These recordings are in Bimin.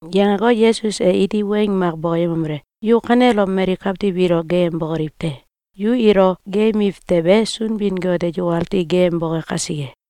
Yangeko, Yesus e iti weng mak bokoyemomele: “Yu kanelom mali kawtiw ilo geeyembokoliw te! Yu ilo geeyembiw tewe, Sunbin-Got e yukati geeyemboke kasike.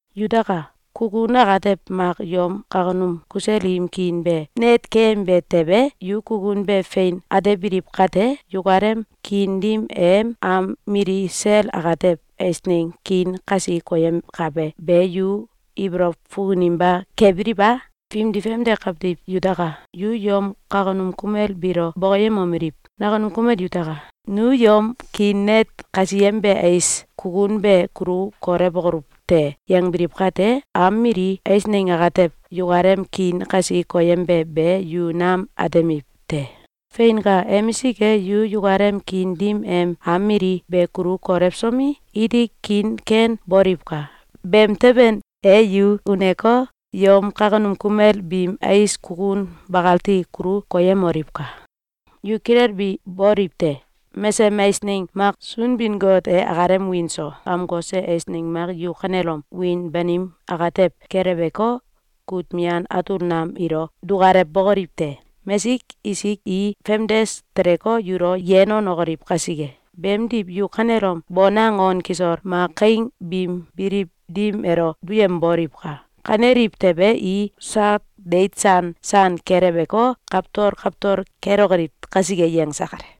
Yutaka! Kukun atew mak yom kawkunum kusel im kiin be net keyembe tewe, yu kukun be fein atebiliw kate, yukalem kiin dim em am mili sel atew eisneng kiin kasi koyemkabe be yu ibolow fukuninba kebiliw a? Fimdi famde kawtiw yutaka! Yu yom kawkunum kumel biilo bokoyemomeliw: ‘Nakunum kumel yutaka! Nu yom kiin net kasiyembe ais kukun be kulu kolewokoluw te!’, yangbiliw kate, am mili eisneng atew yukalem kiin kasi koyembe be yu nam atemiw te! Feinka! Emisik e, yu yukalem kiin dim em am mili be kulu kolewsomi, iti kiin ken boliwka! Beemteben e, yu uneko, yom kawkunum kumel biim ais kukun bakati kulu koyemoliwka! Yu kilelbi boliw te! Mesesem eisneng mak Sunbin-Got e akalem wiin so amkose eisneng mak yu kanelom wiin banim atew keleweko, kut mian atul nam ilo dukalewbokoliw te! Mesik isik i famdes teleko, yulo yen wanokoliw kasike. Beemdiw, yu kanelom bonang on kisol mak kaing biim biliw dim elo duyemoliwka! Kaneliw tewe, i sak deit san san keleweko, kawtol kawtol kelokoliw kasike.”, yangse kale.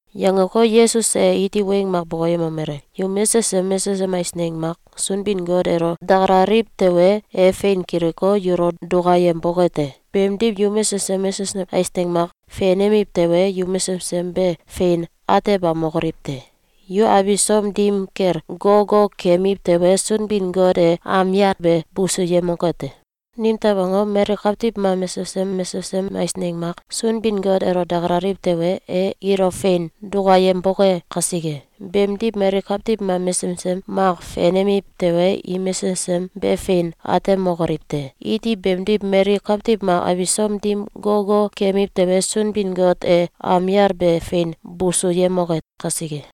Yangeko, Yesus e iti weng mak bokoyemomele: “Yu mesesem mesesem eisneng mak Sunbin-Got elo dakalaliw tewe, e fein kiliko, yulo dukayemboke te. Beemdiw, yu mesesem mesesem eisneng mak fenemiw tewe, yu mesesem be fein atebamokoliw te. Yu abisom dim kel gogo keemiw tewe, Sunbin-Got e am yal be busuyemoke te. Nimtew angom? Mali kawtiw mak mesesem mesesem eisneng mak Sunbin-Got elo dakalaliw tewe, e ilo fein dukayemboke kasike. Beemdiw, mali kawtiw mak mesesem mak fenemiw tewe, i mesesem be fein atemokoliw te. Iti beemdiw, mali kawtiw mak abisom dim gogo keemiw tewe, Sunbin-Got e am yal be fein busuyemoke kasike.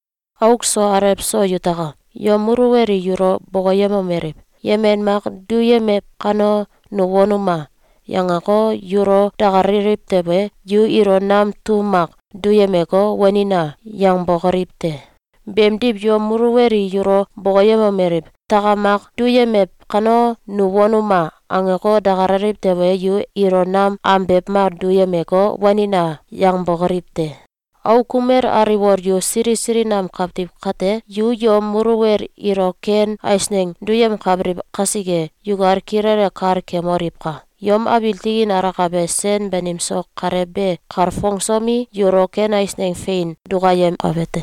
Auk so alew so yutaka! Yom muluwel i yulo bokoyemomeliw: ‘Yemen mak duyemew kano, nu wanuma!’, yangeko, yulo dakalaliw tewe, yu ilo nam tum mak duyemeko, ‘Wanina!’ yangbokoliw te. Beemdiw, yom muluwel i yulo bokoyemomeliw: ‘Takam mak duyemew kano, nu wanuma!’, angeko, dakalaliw tewe, yu ilo nam ambew mak duyemeko, ‘Wanina!’, yangbokoliw te. Auk kumel aliwol yu sili sili nam kawtiw kate, yu yom muluwel ilo ken eisneng duyemkabiliw kasike, yukal kilele kal kemoliwka! Yom abiil tikin alakabe sen banim so Kalew be kalfongsomi, yulo ken eisneng fein dukayemkabe te.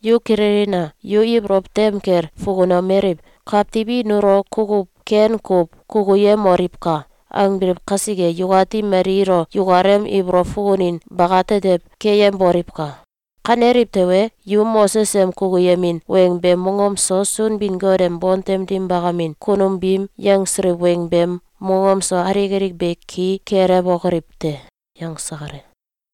Yu kililina! Yu ibolow tem kel fukunomeliw: ‘Kawtiw i nulo kukuw ken kuw kukuyemoliwka!’, angbiliw kasike, yukati mali ilo yukalem ibolow fukunin bakatetew keyemboliwka! Kaneliw tewe, yu Moses em kukuyemin weng beem mongom so, Sunbin-Got em bontem dim bakamin kunum biim yangsiliw weng beem mongom so, alik alik be ki kelewokoliw te.”, yangse kale.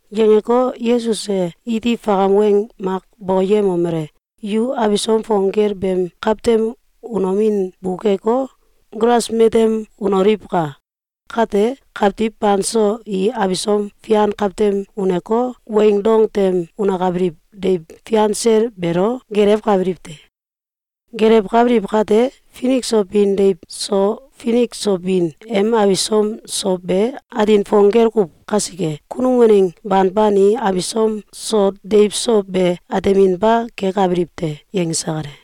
Yangeko, Yesus e iti fakam weng mak bokoyemomele: “Yu abisom fong gel beem kawtem unomin bukeko, gulas matem unoliwka! Kate, kawtiw banso i abisom fian kawtem uneko, weing dong tem unekabiliw deiw fian sel beelo gelewkabiliw te. Gelewkabiliw kate, finik so bin deiw so finik so bin em abisom so be atin fong gel kuw kasike, kunum waneng banban i abisom so deiw so be ateminba kekabiliw te.”, yangse kale.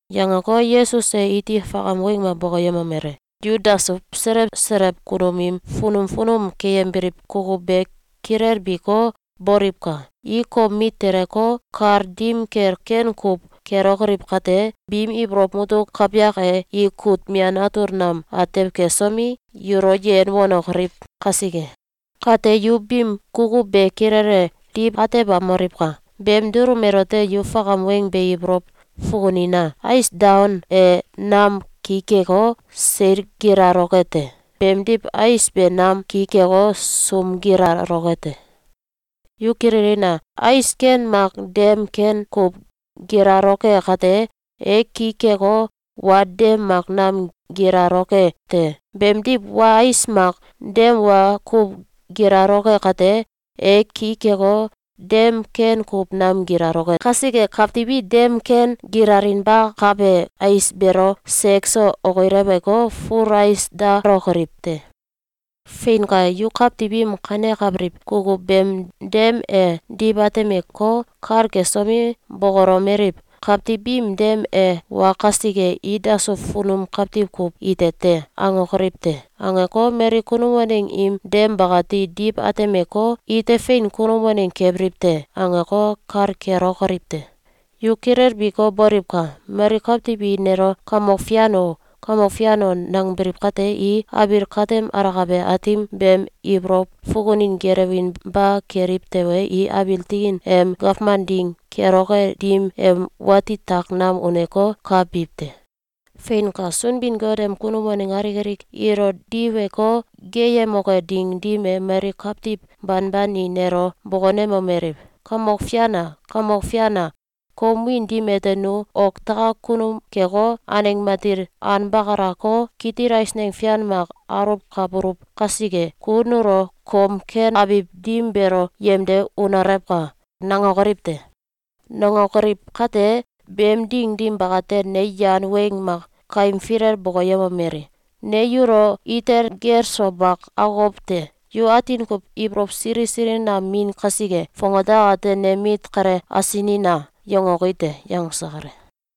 Yangeko, Yesus e iti fakam weng mak bokoyemomele: “Yu dasuw selew selew kunum im funum funum keyembiliw kukuw be kilelbiko, boliwka! I kom mit teleko, kal dim kel ken kuw kelokoliw kate, biim ibolow mutuk kawyak e, i kut mian atul nam atew kesomi, yulo yen wanokoliw kasike. Kate yu biim kukuw be kilele diw atebamoliwka! Beem dulum elote, yu fakam weng be ibolow fukunina! Ais daon e nam ki keko, seil gilaloke te. Beemdiw, ais be nam ki keko, sum gilaloke te. Yu kililina! Ais ken mak dem ken kuw gilaloke kate, e ki keko, wa dem mak nam gilaloke te. Beemdiw, wa ais mak dem wa kuw gilaloke kate, e ki keko, dem ken kuw nam gilaloke kasike, kawtiw i dem ken gilalinbakabe ais beelo sek so okileweko, ful ais dalokoliw te. Feinka! Yu kawtiw im kanekabiliw kukuw beem dem e diw atemeko, kal kesomi, bokolomeliw: ‘Kawtiw biim dem e wa kasike, i dasuw funum kawtiw kuw ite te!’, angokoliw te. Angeko, mali kunum waneng im dem bakati diw atemeko, ‘Ite fein kunum waneng kebiliw te!’, angeko, kal kelokoliw te. Yu kilelbiko, boliwka! Mali kawtiw i nelo ‘Kamok Fian o! Kamok Fian o!’, nangbiliw kate, i abiil katem alakabe Aatim beem ibolow fukunin gelewinba keliw tewe, i abiil tikin em gawman ding keloke dim em wati tak nam uneko, ka biw te. Feinka! Sunbin-Got em kunum waneng alik alik ilo diweko geeyemoke ding dim e, mali kawtiw banban i nelo bokonemomeliw: ‘Kamok Fian a! Kamok Fian a! Kom wiin dim ete nu oktakak kunum keko, aneng matil anbakalako, kitil eisneng fian mak aluwkabuluw kasike, ku nulo kom ken abiw dim beelo yemde unolewka!’, nangokoliw te. Nangokoliw kate, beem ding dim bakate, ne yan weng mak kaim filel bokoyemomeli: ‘Ne yulo itel gel so mak akokow te. Yu atin kuw ibolow sili sili nam min kasike, fongate akate nem mit kale asinina!’, yangoki te.”, yangse kale.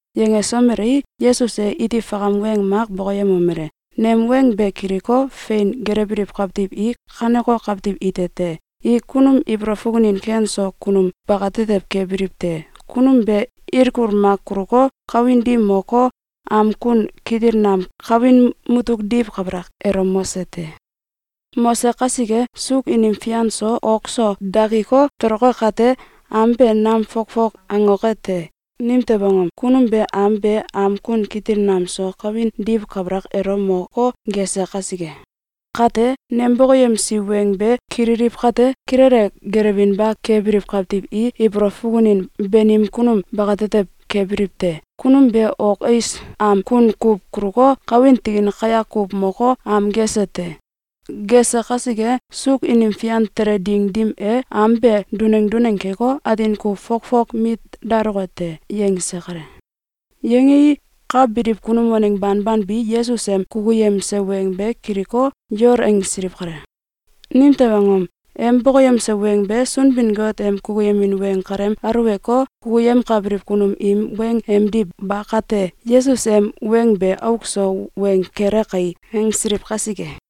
Yangesomelei, Yesus e iti fakam weng mak bokoyemomele: “Nem weng be kiliko, fein gelewbiliw kawtiw i kaneko kawtiw ite te? I kunum ibolow fukunin ken so kunum bakatetew kebiliw te. Kunum be ilkul mak kuluko, kawin dim moko, am kun kitil nam kawin mutuk diw kabalak elo mose te. Mose kasike, suuk inim fian so ok so dakiko, toloke kate, am be nam fokfok angoke te. Nimew angom? Kunum be am be am kun kitil nam so kawin diw kabalak elo moko, gese kasike. Kate, nem bokoyemsi weng be kililiw kate, kilele gelewinba kebiliw kawtiw i ibolow fukunin banim kunum bakatetew kebiliw te. Kunum be ok ais am kun kuw kuluko, kawin tikin kayak kuw moko, am gese te. Gese kasike, suuk inim fian tele ding dim e, am be duneng duneng keko, atin kuw fokfok mit daloke te.”, yangse kale. Yangei, ka biliw kunum waneng banban bi Yesus em kukuyemse weng be kiliko, yol angsiliw kale. Nimtew angom? Em bokoyemse weng be Sunbin-Got em kukuyemin weng kalem aulewko, kukyemkabiliw kunum im weng emdiw ba kate, “Yesus em weng be auk so weng kele kai!”, angsiliw kasike.